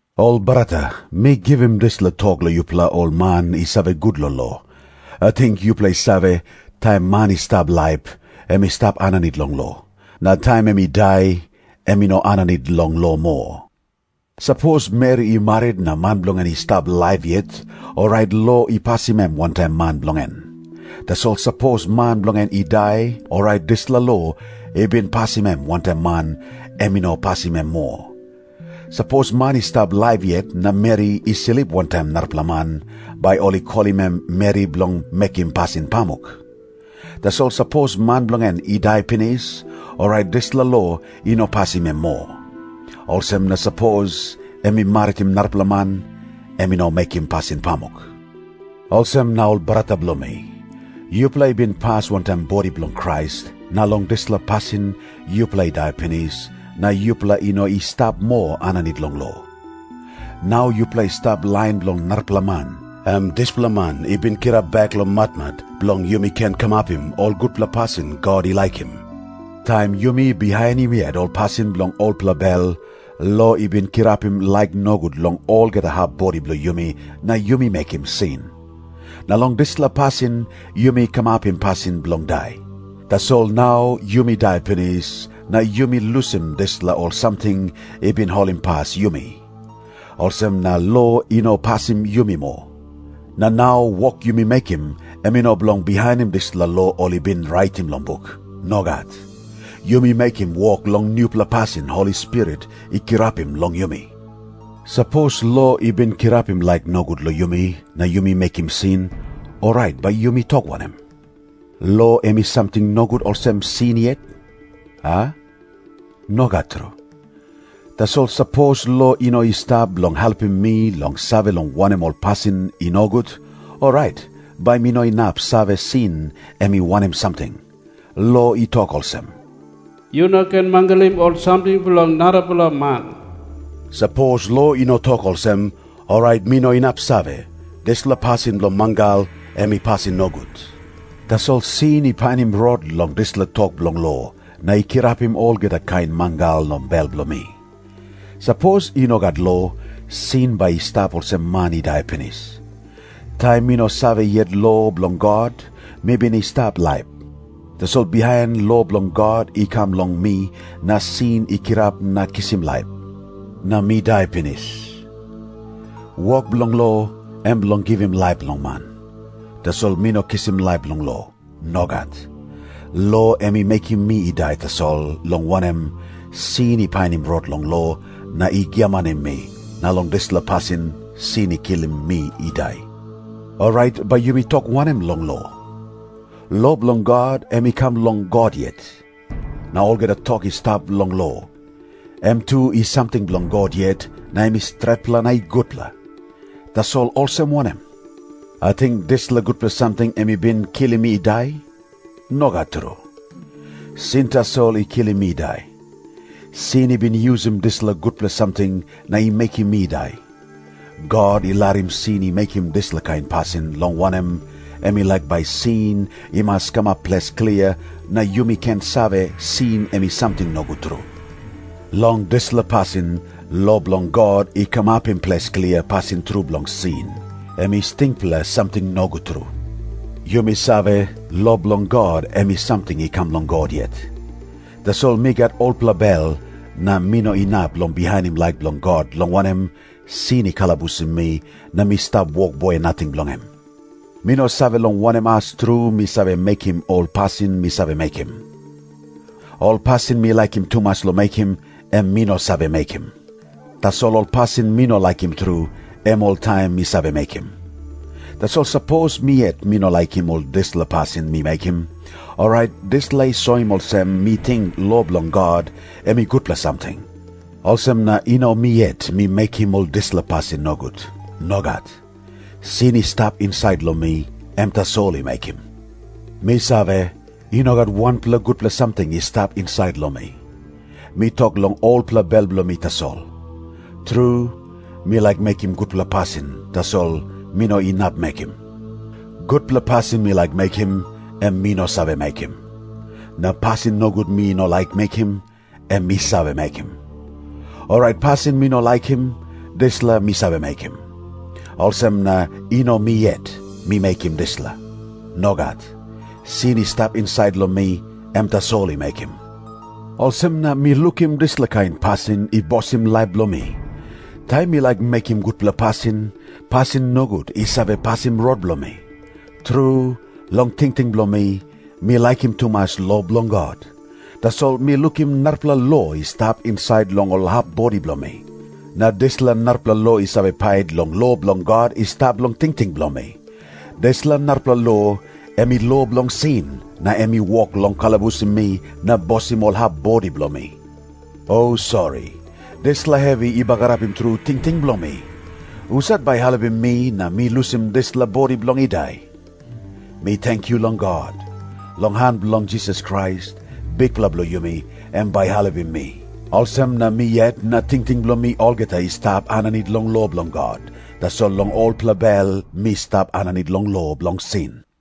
Ol brata, mi givim dispela tok long yupela ol man i save gut long lo. Ating yupela i save, taim man i stap laip, em i stap aninit long lo. Na taim em i dai, em i no aninit long lo moa. Sapos meri i marit na man bilong en i stap laip yet, orait lo i pasim em wantaim man bilong en. Tasol sapos man bilong en i dai, orait dispela lo i bin pasim em wantaim man, em i no pasim em moa. Sapos man i stap laip yet na meri i slip wantaim narapela man, bai ol i kolim em meri bilong mekim pasin pamuk. Tasol sapos man bilong en i dai pinis, orait dispela lo i no pasim em moa. Olsem na sapos em i maritim narapela man, em i no mekim pasin pamuk. Olsem na ol brata bilong mi, yupela i bin pas wantaim bodi bilong Krais, na long dispela pasin yupela i dai pinis, na yupela i no i stap moa aninit long lo. Nau yupela i stap lain bilong narapela man, em dispela Man i bin kirap bek long matmat, bilong yumi ken kamapim ol gutpela pasin God i laikim. Taim yumi bihainim yet ol pasin bilong olpela bel, lo i bin kirapim laik nogut long olgeta hap bodi bilong yumi na yumi mekim sin. Na long dispela pasin yumi kamapim pasin bilong dai. Tasol nau yumi dai pinis na yumi lusim dispela ol samting i bin holimpas yumi. Olsem na lo i no pasim yumi moa. Na nau wok yumi mekim em i no bilong bihainim dispela lo ol i bin raitim long buk. Nogat. Yumi mekim wok long nupela pasin Holi Spirit i kirapim long yumi. Sapos lo i bin kirapim laik nogut long yumi na yumi mekim sin, orait bai yumi tok wanem? Lo em i samting nogut olsem sin yet, a? Nogat tru. Tasol sapos lo i no i stap bilong helpim mi long save long wanem ol pasin i nogut, orait bai mi no inap save sin em i wanem samting. Lo i tok olsem, “Yu no ken mangalim ol samting bilong narapela man.” Sapos lo i no tok olsem, orait mi no inap save, dispela pasin bilong mangal, em i pasin nogut. Tasol sin i painim rot long dispela tok bilong lo, na i kirapim olgeta kain mangal long bel bilong mi. Sapos i no gat lo, sin bai i stap olsem man i dai pinis. Taim mi no save yet lo bilong God, mi bin i stap laip. Tasol bihain lo bilong God i kam long mi, na sin i kirap na kisim laip, na mi dai pinis. Wok bilong lo, em bilong givim laip long man. Tasol mi no kisim laip long lo. Nogat. Lo em i mekim mi i dai tasol, long wanem, sin i painim rot long lo, na i giamanim mi, na long dispela pasin sin i kilim mi i dai. Orait bai yumi tok wanem long lo? Lo bilong God, em i kam long God yet. Na olgeta tok i stap long lo, em tu i samting bilong God yet, na em i stretpela na i gutpela. Tasol olsem wanem? Ating dispela gutpela samting em i bin kilim mi i dai? Nogat tru. Sin tasol i kilim mi i dai. Sin i bin yusim dispela gutpela samting na i mekim mi i dai. God i larim sin i mekim dispela kain pasin, long wanem, em i laik bai sin i mas kamap ples klia, na yumi ken save sin em i samting nogut tru. Long dispela pasin, lo bilong God i kamapim ples klia pasin tru bilong sin, em i stingpela samting nogut tru. Yumi save, lo bilong God, em i samting i kam long God yet. Tasol mi gat olpela bel, na mi no inap long bihainim laik bilong God, long wanem, sin i kalabusim mi na mi stap wokboi nating bilong em. Mi no save long wanem as tru mi save mekim ol pasin mi save mekim. Ol pasin mi laikim tumas long mekim, em mi no save mekim. Tasol ol pasin mi no laikim tru, em oltaim mi save mekim. Tasol sapos mi yet mi no laikim ol dispela pasin mi mekim, orait dispela i soim olsem mi ting lo bilong God em i gutpela samting. Olsem na i no mi yet mi mekim ol dispela pasin nogut. Nogat. Sin i stap insait long mi, em tasol i mekim. Mi save, i no gat wanpela gutpela samting i stap insait long mi. Mi tok long olpela bel bilong mi tasol. Tru, mi laik mekim gutpela pasin, tasol mi no inap mekim. Gutpela pasin mi laik mekim, em mi no save mekim. Na pasin nogut mi no laik mekim, em mi save mekim. Orait pasin mi no laikim, dispela mi save mekim. Olsem na i no mi yet mi mekim dispela. Nogat. Sin i stap insait long mi, em tasol i mekim. Olsem na mi lukim dispela kain pasin i bosim laip bilong mi. Taim mi laik mekim gutpela pasin, pasin nogut i save pasim rot bilong mi. Tru, long tingting bilong mi, mi laikim tumas lo bilong God. Tasol mi lukim narapela lo i stap insait long ol hap bodi bilong mi. Na dispela narapela lo i save pait long lo bilong God i stap long tingting bilong mi. Dispela narapela lo, em i lo bilong sin, na em i wok long kalabusim mi na bosim ol hap bodi bilong mi. O sori, dispela hevi i bagarapim tru tingting bilong mi! Husat bai i helpim mi na mi lusim dispela bodi bilong i dai? Mi tenkyu long God! Long han bilong Jisas Krais, Bikpela bilong yumi, em bai i helpim mi. Olsem na mi yet na tingting bilong mi olgeta i stap aninit long lo bilong God, tasol long olpela bel mi stap aninit long lo bilong sin.